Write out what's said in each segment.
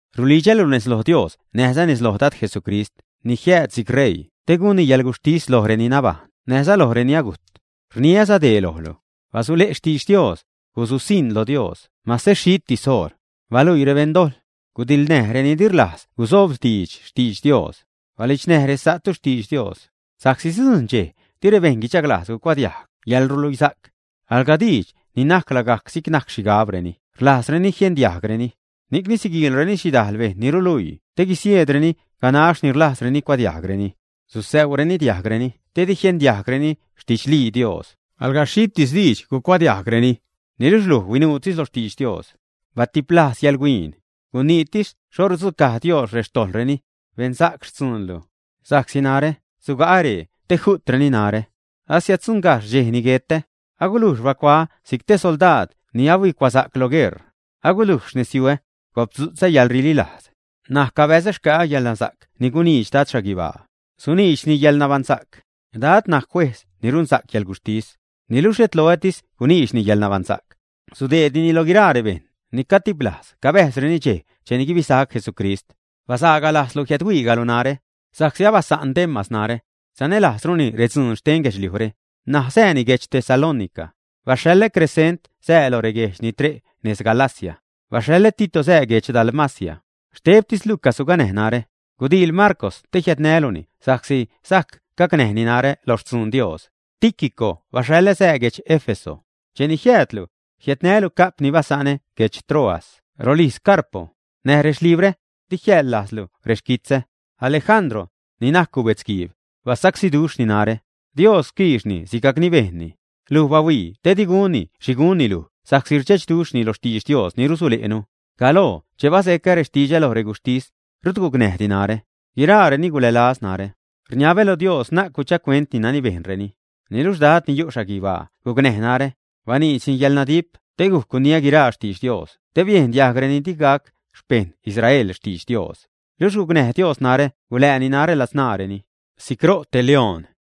Rulidxälu nez lo Dios näjza nez lo Dad Jesucrist ni jiääd si'c ṟeii te gunni yäḻguxhtis loj reni nabajṉ näjza loj reni agujt; rniäza dee lojlu: basule' xtidx Dios, gususiṉ lo Dios mase xhitis oṟ. Baluii rebeṉ dojḻ, gudiḻnäj reni di rlajz guzobdiidx xtidx Dios, balidxnäj resa'tu xtidx Dios. Sa'csi sidzujṉ dxej di rebejṉ guidxaglajz gucuadiajg yäḻrluisa'c; alga diidx ni najc lagajc si'c najc xhigabreni rlajzreni jiendiajgreni, ni'cni siguiilreni xhidajl bejṉ ni ruluii te guisieedreni ganax ni rlajzreni gucuadiajgreni. Susäuureni diajgreni te di jiendiajgreni xtidxlii Dios; alga xhitis diidx gucuadiajgreni. Niluxh luj huinuutis lo xtidx Dios, batiplajz yäḻhuin, guniitis xho rudzucaj Dios rextojḻreni, beṉsa'c xtzuunlu. Sa'csi narä suga'ä ree te ju'treni narä, asiäddzuṉgajxh dxej ni guetä. Agulujx bacuaä si'c te soldaad ni huicuasa'c lo gueṟ, agulujx xnezyuä, gopdzutzä yäḻrililajz. N̲aj cabäzä xca'a yäḻnasa'c ni guniidx Dad xhaguibaa, suniidxni yäḻnabaṉsa'c. Dad najc juejz ni runsa'c yäḻguxhtis. Niluxh xhet loätis guniidxni yaḻnabaṉsa'c. Sudeednini loj guiraa rebejṉ ni catiplajz cabäjzreni dxej cheni guibisac Jesucrist. Basaaga lajzlu jiädhuigajlu narä; sa'csi abasa'n Demas narä. Sanälajzruni redzuun xten guedxliujre, ṉaj sääni guedx Tesalónica. Baxhaḻä Cresent sää lo reguejdx ni re' nez Galacia. Baxhaḻä Tito sää guedx Dalmacia. Xtebtis Lucas suganäj narä. Gudiil Marcw te jiädnäluni sa'csi sajc gacnäjni narä lo xtzun Dios. Tíquico baxhaḻä sää guedx Éfeso. Cheni jiäädlu, jiädnälu ca'p ni basa'nä guedx Troas rolijz Carpo, näj rexlibrä; di jiäḻza lajzlu rexquitzä. Alejandro, ni najc gubetzguiib, basacsíduxhni narä. Dios quiixni sigajcni bejnni. Luj bahuii te di gunni xhi gunni luj sa'csi rdxechduxhni lo xtidx Dios ni rusule'nu. Galoo che bazecä diidx lo reguxhtis, rut gucnäjdi narä; guiraareni gulälazreni narä. Rniabä lo Dios na'c guchagcuentni nani bejnreni. Niluxh Dad ni yu' xhaguibaa gucnäj narä, baniidxni yäḻnadip te gujc guniä guiraa xtidx Dios te biejn diajg reni digac xpeṉ Israel xtidx Dios. Luxh gucnäj Dios narä gulääni narä ladzṉaareni, si'c ro' te beedz.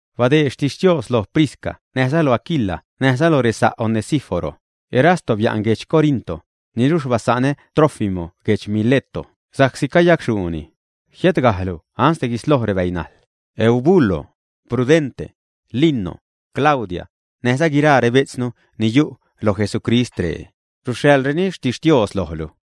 Badeed xtixtios lo Prisca näjza lo Aquila näjza loj resa' Onesíforo. Erasto bia'n guedx Corinto, niluxh basa'nä Trófimo guedx Mileto sa'csi cayacxhuuni. Jiädgajlu ansde guisloj rebäinajḻ. Eubulo, Pudente, Lino, Claudia, näjza guiraa rebejtznu ni yu' lo Jesucrist ree, ruxhaḻreni xtixtios lojlu.